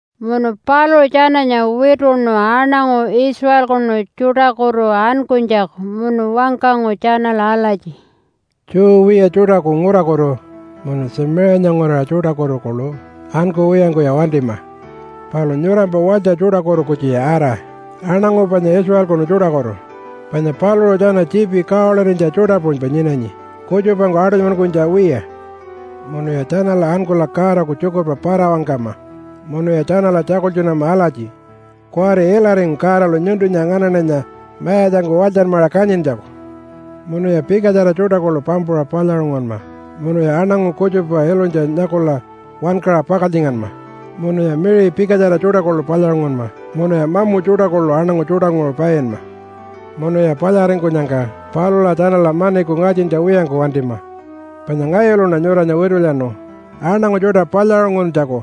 Munu paluṟu tjananya wituṉu aṉangu Israelkunu tjuṯakutu ankunytjaku munu wangkangu tjanala alatji, “Jew wiya tjuṯaku ngurakutu munu Tjamiṟiyanya nguraṟa tjuṯakutu kuḻu ankuwiyangkuya wantima! Palu nyurampa walytja tjuṯakutu kutjuya ara aṉangu panya Israelkunu tjuṯakutu, panya paluṟu tjana tjiipi kawalirinytja tjuṯa puṟunypa nyinanyi kutjupangku aṯunymankunytja wiya. Munuya tjanala ankula Godaku tjukurpa para-wangkama munuya tjanala tjakultjunama alatji, ‘Kuwari ilaringu Godalu nyuntunya nganaṉanya mayatjangku walytjanmaṟa kanyintjaku.’ Munuya pikatjara tjuṯa kuḻu pampuṟa palyaṟungunma, munuya aṉangu kutjupa ilunytja nyakula wankaṟa pakaltjinganma, munuya miṟi pikatjara tjuṯa kuḻu palyaṟungunma, munuya mamu tjuṯa kuḻu aṉangu tjuṯanguṟu painma. Munuya palyaringkunyangka palula tjanala maniku ngatjintja wiyangku wantima, panya ngayuluṉa nyuranya witulyanu aṉangu tjuṯa palyaṟunguntjaku,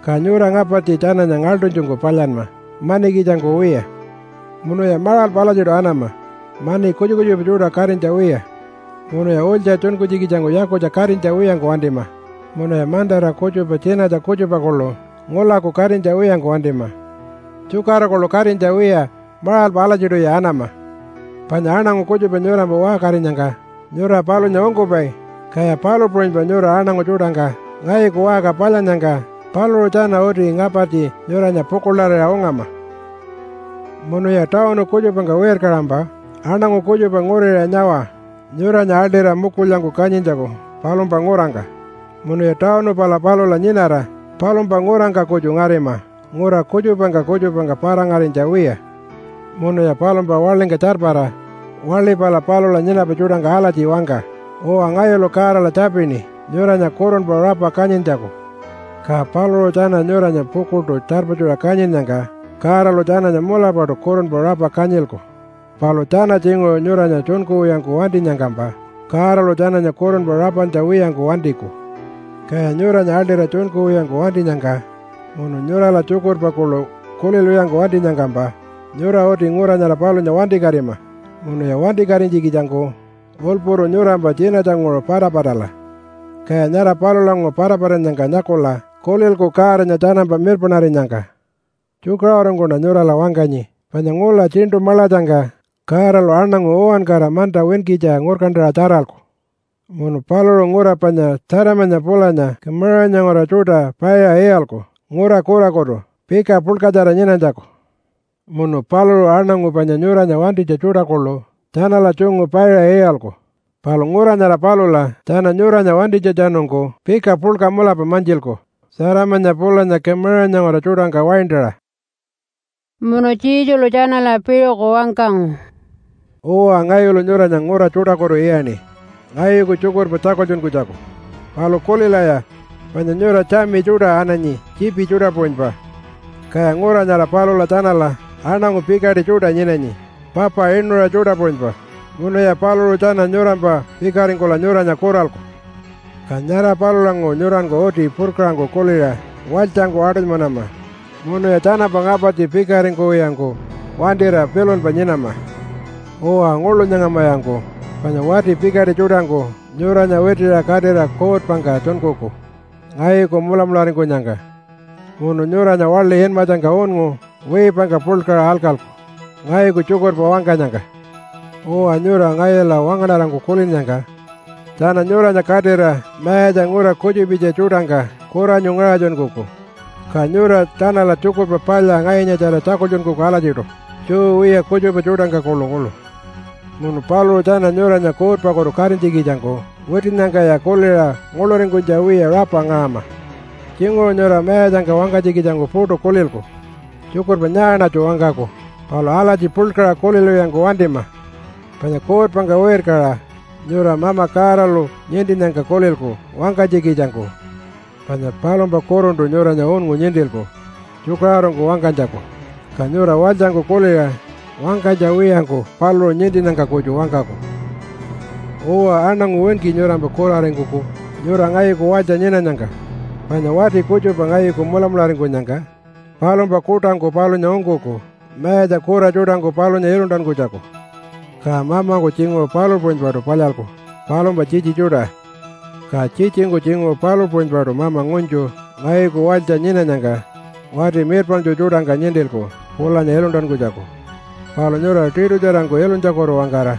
ka nyura ngapartji tjananya ngaḻṯunytjungku palyanma manikitjangku wiya. Munuya maṟalpa alatjiṯu anama mani kutjupa kutjupa tjuṯa katinytja wiya, munuya ulytja tjunkunytjikitjangku yakutja katinytja wiyangku wantima, munuya mantara kutjupa tjinatja kutjupa kuḻu ngulaku katinytja wiyangku wantima, tjukara kuḻu katinytja wiya maṟalpa alatjiṯuya anama. Panya aṉangu kutjupa nyurampa waṟkarinyangka nyura palunya ungkupai, kaya palu puṟunypa nyura aṉangu tjuṯangka ngayuku waṟka palyannyangka paluṟu tjana uti ngapartji nyuranya pukuḻarira ungama. “Munuya tawunu kutjupangka wirkaṟampa aṉangu kutjupa nguriṟa nyawa nyuranya aḻṯira mukulyangku kanyintjaku palumpa ngurangka. Munuya tawunu pala palula nyinara palumpa ngurangka kutju ngarima ngura kutjupangka kutjupangka para-ngarinytja wiya. Munuya palumpa waḻingka tjarpara waḻi pala palula nyinapai tjuṯangka alatji wangka, ‘Uwa, ngayulu Godala tjapini nyuranya kurunpa rapa kanyintjaku.’ Ka paluṟu tjana nyuranya pukuḻṯu tjarpatjuṟa kanyinnyangka Godalu tjananya mulapaṯu kurunpa rapa kanyilku, palu tjana tjinguṟu nyuranya tjunkuwiyangku wantinyangkampa Godalu tjananya kurunpa rapantja wiyangku wantiku. Kaya nyuranya aḻṯira tjunkuwiyangku wantinyangka munu nyurala tjukurpa kuḻu kulilwiyangku wantinyangkampa nyura uti ngura nyara palunya wantikatima munuya wantikatinytjikitjangku ulpuru nyurampa tjinatjanguṟu patapatala, kaya nyara palulanguṟu patapatannyangka nyakula kulilku Godanya tjanampa mirpaṉarinyangka. Tjukaṟurungkuṉa nyurala wangkanyi, panya ngula Tjiṉṯu Maḻatjangka Godalu aṉangu uwankara manta winkitja ngurkantaṟa tjaralku. Munu paluṟu ngura panya Tjatamanya pulanya Kumaṟanya nguraṟa tjuṯa paiṟa iyalku ngura kurakutu pika puḻkatjara nyinanytjaku. Munu paluṟu aṉangu panya nyuranya wantinytja tjuṯa kuḻu tjanala tjungu paiṟa iyalku, palu ngura nyara palula tjana nyuranya wantinytjatjanungku pika puḻka mulapa mantjilku Tjatamanya pulanya Kumaṟanya nguraṟa tjuṯangka waintaṟa.” Munu Jesulu tjanala piṟuku wangkangu, “Uwa, ngayulu nyuranya ngura tjuṯakutu iyaṉi ngayuku tjukurpa tjakultjunkunytjaku. Palu kulilaya, panya nyura tjami tjuṯa ananyi tjiipi tjuṯa puṟunypa, kaya ngura nyara palula tjanala aṉangu pikaṯi tjuṯa nyinanyi papa inuṟa tjuṯa puṟunypa, munuya paluṟu tjana nyurampa pikaringkula nyuranya kuralku. Ka nyara palulanguṟu nyuranku uti purkaṟangku kuliṟa walytjangku aṯunymanama munuya tjanampa ngapartji pikaringkuwiyangku wantira pilunpa nyinama. Uwa, nguḻu nyangamayanku, panya wati pikaṯi tjuṯangku nyuranya witiṟa katira kuutpangka tjunkuku ngayuku mulamularingkunyangka, munu nyuranya waḻi inmatjangka unngu wiipangka puḻkaṟa alkalku ngayuku tjukurpa wangkanyangka. Uwa, nyura ngayula wangaṉarangku kulinnyangka tjana nyuranya katira mayatja ngura kutjupitja tjuṯangka kuranyu ngaṟatjunkuku, ka nyura tjanala Tjukurpa Palya ngayunyatjara tjakultjunkuku alatjiṯu, Jew wiya kutjupa tjuṯangka kuḻukuḻu. Munu paluṟu tjana nyuranya kuutpakutu katinytjikitjangku witinnyangkaya kuliṟa nguḻuringkunytja wiya rapa ngaṟama. Tjinguṟu nyura mayatjangka wangkanytjikitjangku puṯu kulilku, ‘Tjukurpa nyaaṉatju wangkaku?’ Palu alatji puḻkaṟa kulilwiyangku wantima, panya kuutpangka wirkaṟa nyura Mama Godalu nintinnyangka kulilku wangkanytjikitjangku. Panya palumpa kuruntu nyuranya unngu nintilku tjukaṟurungku wangkanytjaku. Ka nyura walytjangku kuliṟa wangkanytja wiyangku paluṟu nintinnyangka kutju wangkaku. Uwa, aṉangu winki nyurampa kuraringkuku nyura ngayuku walytja nyinanyangka. Panya wati kutjupa ngayuku mulamularingkunyangka palumpa kuṯangku palunya ungkuku mayatja kura tjuṯangku palunya iluntankunytjaku. Ka mamangku tjinguṟu palu puṟunypaṯu palyalku palumpa tjitji tjuṯa. Ka tjitjingku tjinguṟu palu puṟunypaṯu mama ngunytju ngayuku walytja nyinanyangka wati mirpaṉtju tjuṯangka nintilku pulanya iluntankunytjaku. Palu nyura tiṯutjarangku ilunytjakutu-wangkara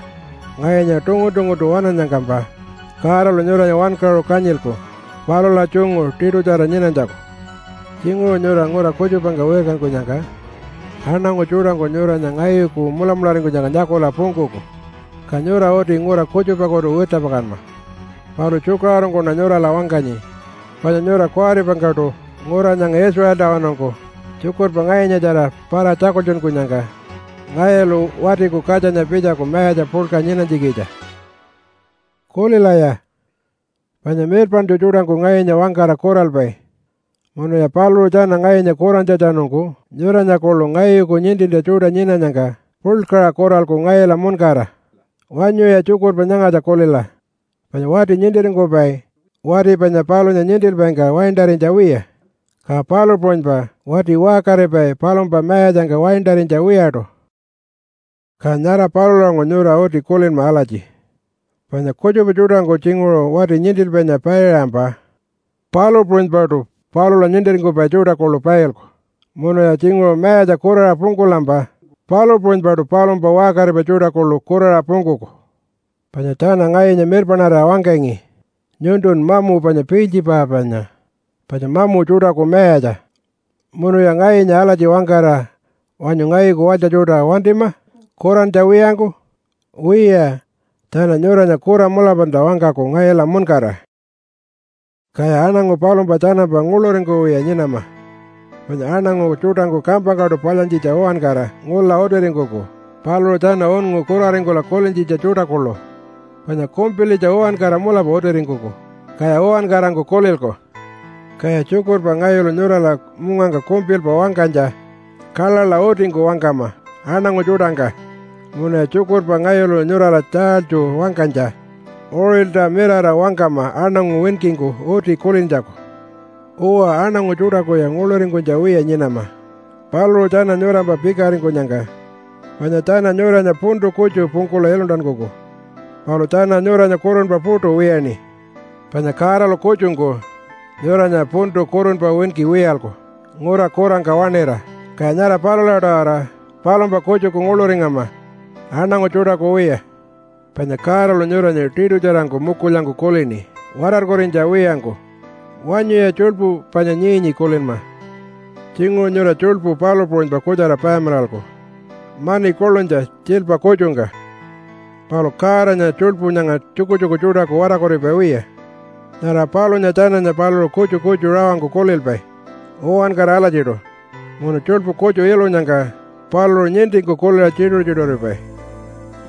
ngayunya tungun-tunguntu waṉannyangkampa Godalu nyuranya wankaṟu kanyilku palula tjungu tiṯutjara nyinanytjaku. Tjinguṟu nyura ngura kutjupangka wirkankunyangka aṉangu tjuṯangku nyuranya ngayuku mulamularingkunyangka nyakula pungkuku, ka nyura uti ngura kutjupakutu wirtjapakanma. Palu tjukaṟurungkuṉa nyurala wangkanyi, panya nyura kuwaripangkuṯu ngura nyanga Israeltawanungku tjukurpa ngayunyatjara para-tjakultjunkunyangka ngayulu Watiku Katjanya pitjaku mayatja puḻka nyinanytjikitja. “Kulilaya, panya mirpaṉtju tjuṯangku ngayunya wangkara kuralpai, munuya paluṟu tjana ngayunya kurantjatjanungku nyuranya kuḻu ngayuku nintintja tjuṯa nyinanyangka puḻkaṟa kuralku ngayula muṉkara. Wanyuya tjukurpa nyangatja kulila, ‘Panya wati nintiringkupai wati panya palunya nintilpaingka waintarinytja wiya, ka palu puṟunypa wati waṟkaripai palumpa mayatjangka waintarinytja wiyaṯu.’ Ka nyara palulanguṟu nyura uti kulinma alatji, panya kutjupa tjuṯangku tjinguṟu wati nintilpainya paiṟampa palu puṟunypaṯu palula nintiringkupai tjuṯa kuḻu pailku. Munuya tjinguṟu mayatja kuraṟa pungkulampa palu puṟunypaṯu palumpa waṟkaripai tjuṯa kuḻu kuraṟa pungkuku. Panya tjana ngayunya mirpaṉarira wangkangi, ‘Nyuntun mamu panya Piiltjipanya, panya mamu tjuṯaku mayatja.’ Munuya ngayunya alatji wangkara wanyu ngayuku walytja tjuṯa wantima kurantja wiyangku? Wiya, tjana nyuranya kura mulapalta wangkaku ngayula muṉkara.” “Kaya aṉangu palumpa tjanampa nguḻuringkuwiya nyinama, panya aṉangu tjuṯangku kampangkaṯu palyantjitja uwankara ngula utiringkuku, paluṟu tjana unngu kuraringkula kulintjitja tjuṯa kuḻu, panya kumpilitja uwankara mulapa utiringkuku, kaya uwankarangku kulilku. Kaya tjukurpa ngayulu nyurala mungangka kumpilpa wangkanytja kaḻaḻa utingku wangkama aṉangu tjuṯangka, munuya tjukurpa ngayulu nyurala tjaalytju wangkanytja uṟilta mirara wangkama aṉangu winkingku uti kulintjaku. Uwa, aṉangu tjuṯakuya nguḻuringkunytja wiya nyinama paluṟu tjana nyurampa pikaringkunyangka, panya tjana nyuranya puntu kutju pungkula iluntankuku, palu tjana nyuranya kurunpa puṯu wiyaṉi. Panya Godalu kutjungku nyuranya puntu kurunpa winki wiyalku ngura kurangka waṉira, kaya nyara palula-tawara palumpa kutjuku nguḻuringama aṉangu tjuṯaku wiya. Panya Godalu nyuranya tiṯutjarangku mukulyangku kulini watarkurinytja wiyangku. Wanyuya tjuḻpu panya nyii-nyii kulinma. Tjinguṟu nyura tjuḻpu palu puṟunypa kutjara payamilalku mani kuḻunytja tjiilpa kutjungka. Palu Godanya tjuḻpu nyanga tjukutjuku tjuṯaku watarkuripai wiya. Nyara palunya tjananya paluṟu kutju kutju rawangku kulilpai uwankara alatjiṯu munu tjuḻpu kutju ilunyangka paluṟu nintingku kuliṟa tjituṟu-tjituṟuripai.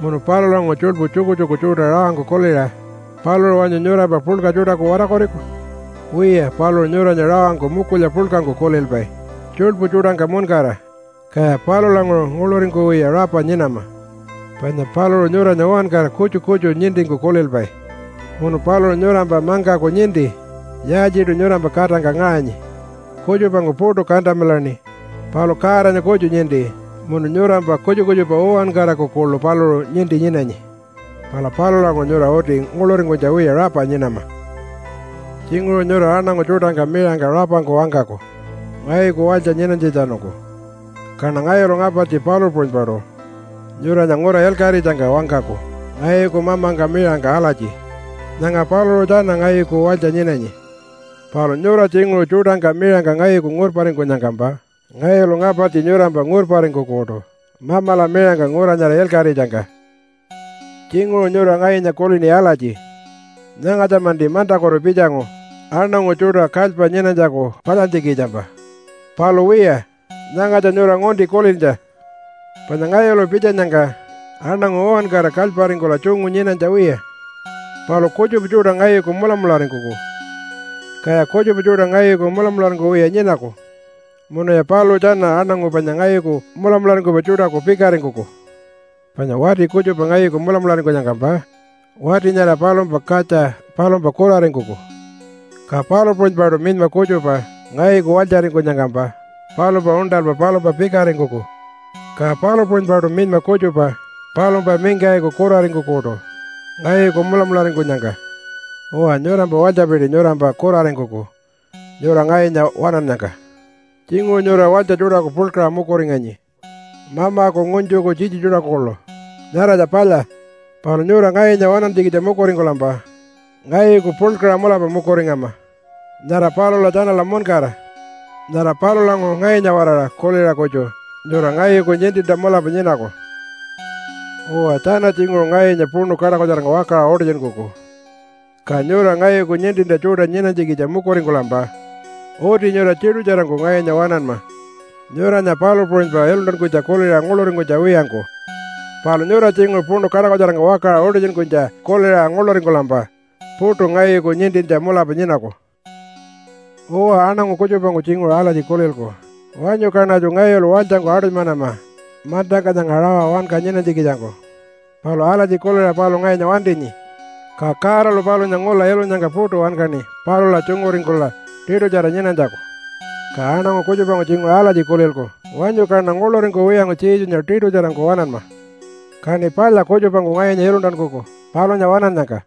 Munu palulanguṟu tjuḻpu tjukutjuku tjuṯa rawangku kuliṟa paluṟu wanyu nyurampa puḻka tjuṯaku watarkuriku? Wiya, paluṟu nyuranya rawangku mukulya puḻkangku kulilpai tjuḻpu tjuṯangka muṉkara, kaya palulanguṟu nguḻuringkuwiya rapa nyinama. Panya paluṟu nyuranya uwankara kutju kutju nintingku kulilpai. Munu paluṟu nyurampa mangkaku ninti yaaltjiṯu nyurampa katangka ngaṟanyi. Kutjupangku puṯu kantamilaṉi, palu Godanya kutju ninti, munu nyurampa kutjupa kutjupa uwankaraku kuḻu paluṟu ninti nyinanyi. Pala palulanguṟu nyura uti nguḻuringkunytja wiya rapa nyinama.” “Tjinguṟu nyura aṉangu tjuṯangka miṟangka rapangku wangkaku ngayuku walytja nyinanytjatjanungku, kaṉa ngayulu ngapartji palu puṟunypaṯu nyuranya ngura ilkaṟitjangka wangkaku ngayuku mamangka miṟangka alatji, ‘Nyanga paluṟu tjana ngayuku walytja nyinanyi.’ Palu nyura tjinguṟu tjuṯangka miṟangka ngayuku ngurparingkunyangkampa ngayulu ngapartji nyurampa ngurparingkukuṯu Mamala miṟangka ngura nyara ilkaṟitjangka. “Tjinguṟu nyura ngayunya kulini alatji, ‘Nyangatja-manti mantakutu pitjangu aṉangu tjuṯa kalypa nyinanytjaku palyantjikitjampa.’ Palu wiya, nyangatja nyura ngunti kulintja, panya ngayulu pitjanyangka aṉangu uwankara kalyparingkula tjungu nyinanytja wiya, palu kutjupa tjuṯa ngayuku mulamularingkuku, kaya kutjupa tjuṯa ngayuku mulamularingkuwiya nyinaku munuya paluṟu tjana aṉangu panya ngayuku mulamularingkupai tjuṯaku pikaringkuku. Panya wati kutjupa ngayuku mulamularingkunyangkampa wati nyara palumpa katja palumpa kuraringkuku, ka palu puṟunypaṯu minyma kutjupa ngayuku walytjaringkunyangkampa palumpa uṉṯalpa palumpa pikaringkuku. Ka palu puṟunypaṯu minyma kutjupa palumpa mingkayiku kuraringkukuṯu ngayuku mulamularingkunyangka. Uwa, nyurampa walytjapiti nyurampa kuraringkuku nyura ngayunya waṉannyangka. Tjinguṟu nyura walytja tjuṯaku puḻkaṟa mukuringanyi mamaku ngunytjuku tjitji tjuṯaku kuḻu, nyaratja palya. Palu nyura ngayunya waṉantjikitja mukuringkulampa ngayuku puḻkaṟa mulapa mukuringama nyara palula tjanala muṉkara. Nyara palulanguṟu ngayunya-waraṟa kuliṟa kutju nyura ngayuku nintintja mulapa nyinaku. “Uwa, tjana tjinguṟu ngayunya puṉu kaṯakutjarangka wakaṟa utitjunkuku, ka nyura ngayuku nintintja tjuṯa nyinanytjikitja mukuringkulampa uti nyura tiṯutjarangku ngayunya waṉanma nyuranya palu puṟunypa iluntankunytja kuliṟa nguḻuringkunytja wiyangku. Palu nyura tjinguṟu puṉu kaṯakutjarangka wakaṟa utitjunkunytja kuliṟa nguḻuringkulampa puṯu ngayuku nintintja mulapa nyinaku. “Uwa, aṉangu kutjupangku tjinguṟu alatji kulilku, ‘Wanyu kaṉatju ngayulu walytjangku aṯunymanama mantangka nyanga rawa wanka nyinanytjikitjangku.’ Palu alatji kuliṟa paluṟu ngayunya wantinyi, ka Godalu palunya ngula ilunyangka puṯu wankaṉi palula tjunguringkula tiṯutjara nyinanytjaku. Ka aṉangu kutjupangku tjinguṟu alatji kulilku, ‘Wanyu kaṉa nguḻuringkuwiyangku Jesunya tiṯutjarangku waṉanma, kaṉi palya kutjupangku ngayunya iluntankuku palunya waṉannyangka.’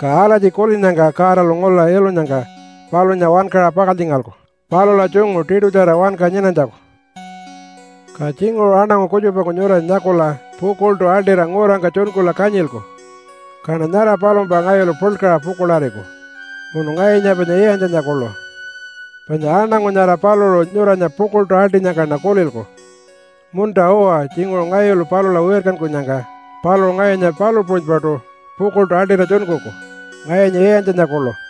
Ka alatji kulinnyangka Godalu ngula ilunyangka palunya wankaṟa pakaltjingalku palula tjungu tiṯutjara wanka nyinanytjaku.” “Ka tjinguṟu aṉangu kutjupangku nyuranya nyakula pukuḻṯu aḻṯira ngurangka tjunkula kanyilku, kaṉa nyara palumpa ngayulu puḻkaṟa pukuḻariku munu ngayunya panya iyantjanya kuḻu. Panya aṉangu nyara paluṟu nyuranya pukuḻṯu aḻṯinyangkaṉa kulilku, ‘Munta-uwa, tjinguṟu ngayulu palula wirkankunyangka paluṟu ngayunya palu puṟunypaṯu pukuḻṯu aḻṯira tjunkuku ngayunya iyantjanya kuḻu.’